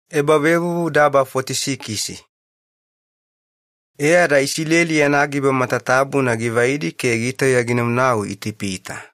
Iyakobo ginau Itipita. E ada Isileli ani yana giba matatabuna givaidi ke gitauya ginanau Itipita.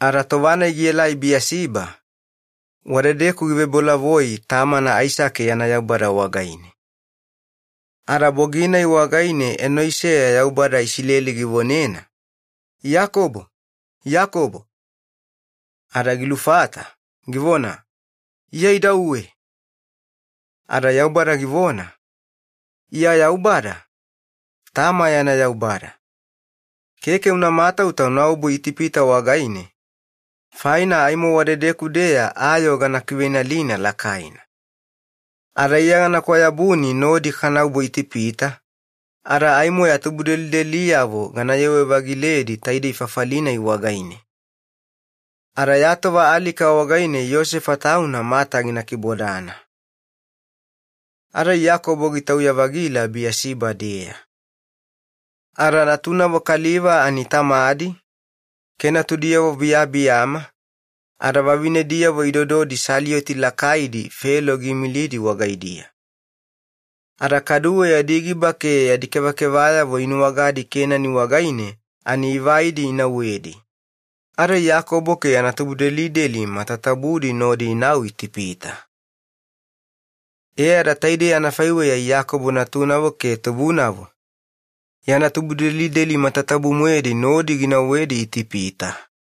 Ada tova-nai gielai Biyasiba, wadedeku givebolavoi tamana Aisake yana Yaubada wagaine. Ada bogi-nai wagaine enoiseya Yaubada Isileli givonena, “Iyakobo, Iyakobo.” Ada gilufata, givona, “Iya idauwe.” Ada Yaubada givona, “Iya Yaubada, tama yana Yaubada. Keke una matauta ya obu Itipita, faina aimo wadedeku-deya ayoo gana kiveinalina lakaina. Ada iya gana kwayabuni nodi kanaobu Itipita, ada velemoena aimo ya tubudelideliyavo ganayewe-vagiledi taidei fafali-nai wagaine. Ada ya tova alika wagaine Yosefa tauna mata gina kibodana.” Ada Iyakobo gitauya-vagila Biyasiba-deya, e ada kaduwe natunavo kaliva ani tamadi ke natudiyavo biyabiyama ada vavinediyavo idododi saliyoti lakaidi Felo giimilidi wagaidiya. Ada kaduwe yadi giba ke yadi kevakevayavo inuwagadi Kenani wagaine ani ivai inauwedi, ada Iyakobo ke yana tubudelideli matatabudi nodi inau Itipita. E ada taidei anafaiweya Iyakobo natunavo ke tubunavo, yana tubudelideli matatabu-moedi nodi ginauwedi Itipita.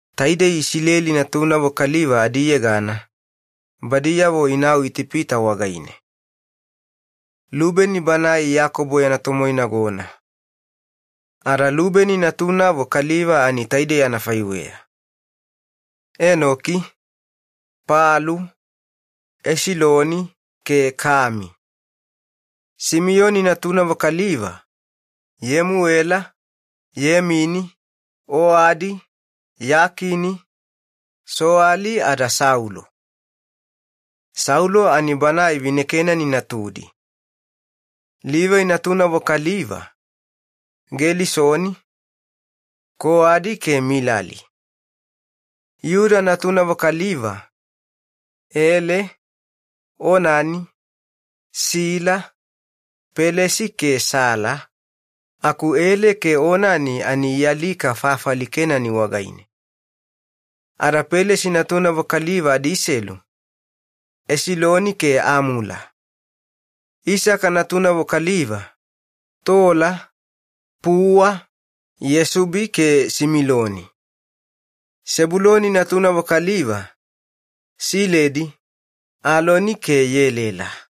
Taidei Isileli natunavo kaliva adiyegana badiyavo inau Itipita wagaine: Lubeni banae Iyakobo yana tomoinagona. Ada Lubeni natunavo kaliva tainei: Enoki, Palu, Esiloni ke Kami. Simiyoni natunavo kaliva: Yemuela, Yemini, Oadi, Yakini, Soali, ada Saulo. Saulo ani banae vineKenani natudi. Livai natunavo kaliva: Gelisoni, Koadi ke Milali. Yuda natunavo kaliva: Ele, Onani, Sila, Pelesi ke Sela, aku Eli ke Sila ani ialika fafali Kenani wagaine. Ada Pelesi natunavo kaliva adiselu: Esiloni ke Amula. Isaka natunavo kaliva: Tola, Pua, Yesubi ke Similoni. Sebuloni natunavo kaliva: Siledi, Eloni ke Yelela.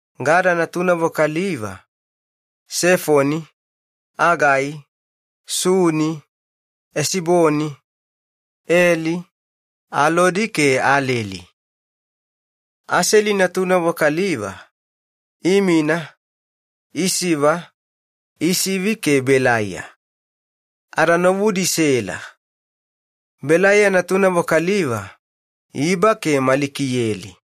Gada natunavo kaliva: Sefoni, Agai, Suni, Esiboni, Eli, Alodi ke Aleli. Aseli natunavo kaliva: Imina, Isiva, Isivi ke Belaiya. Ada novudi Sela. Belaiya natunavo kaliva: Iba ke Malikiyeli.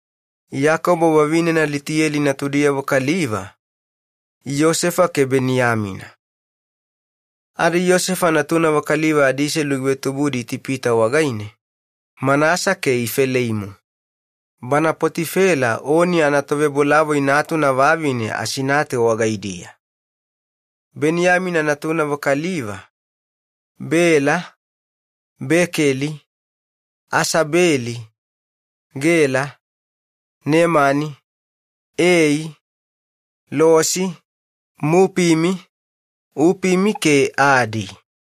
Iyakobo vavinena Litiyeli natudiyavo kaliva: Yosefa ke Beniyamina. Ada Yosefa natunavo kaliva adiselu givetubudi Itipita wagaine: Manasa ke Ifeleimu, bana Poti-Fela Oni anatovebolavoi natuna vavine Asinate wagaidiya. Beniyamina natunavo kaliva: Bela, Bekeli, Asabeli, Gela, Nemani, Ei, Losi, Mupimi, Upimi ke Adi.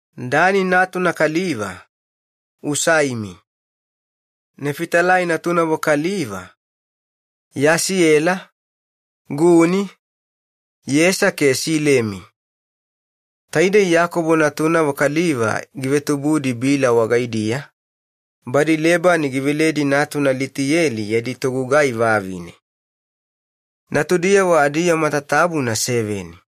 Dani natuna kaliva: Usaimi. Nefitalai natunavo kaliva: Yasiyela, Guni, Yesa ke Silemi. Taidei Iyakobo natunavo kaliva givetubudi Bila wagaidiya, badi Lebani giveledi natuna Litiyeli yadi togugai vavine, ani natudiyavo adiyoo matatabuna seveni.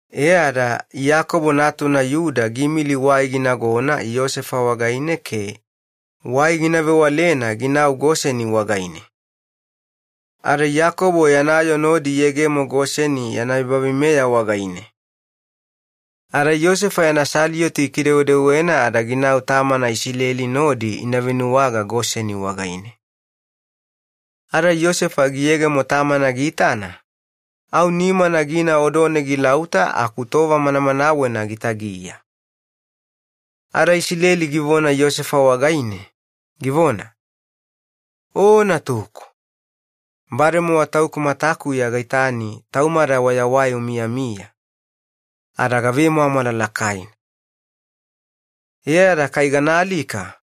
E ada Iyakobo natuna Yuda giimili wai ginagona Yosefa wagaine ke wai gina vewalena ginau Goseni wagaine. Ada Iyakobo yana yoo nodi iyegemo Goseni yana ebaveimeya wagaine. Ada Yosefa yana saliyoti gikidewedewena ada ginau tamana Isileli nodi ina venuwaga Goseni wagaine. Ada Yosefa giyegemo tamana giitana, au nimana gina odone gilauta aku gitagiya tova manamanawena. Ada Isileli givona wagaine, “O natuku, bademowa tauku matakuya gaitani taumada wayawai umiyamiya, ada gavemwamwala lakaina. Ada aimo kukuyeya ganaalika.”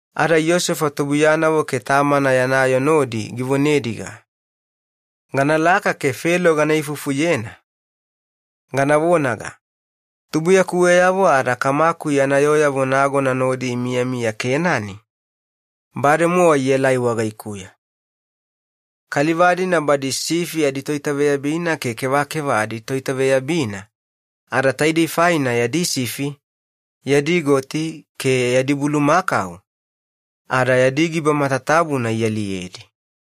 Ada Yosefa tubuiyanavo ke tamana yana yoo nodi givonediga, “Ganalaka ke Felo gana ifufuyena gana vonaga, ‘Tubuiyakuweyavo ada kamaku yana yooyavo nagona nodi imiyamiya Kenani, bademowa ielai wagaikuya. Kaliva-dina badi toitaveyabina sifi ke kevakeva aditoitaveyabina, ada taidei faina yadi sifi, yadi goti ke yadi bulumakau ada yadi giba matatabuna ialiyedi.’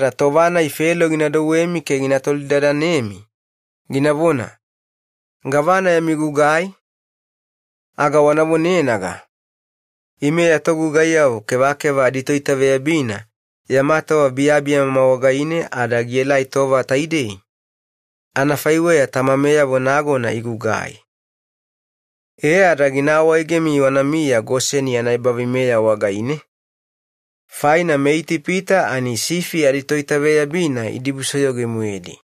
Tova-nai Felo gina douwemi ada gina tolidadanemi, ginavona, ‘Gavana yami gugai?’ aga wana vonenaga, ‘Ime ya togugaiyavo kevakeva aditoitaveyabina yama tova biyabiyama wagaine ada gielai tova taidei, anafaiweya tamameyavo nagona igugai.’ E ada gina awaegemi wanamiya Goseni yana ebaveimeya wagaine, faina meItipita idibusoyoga velemoena toitaveyabina sifi.”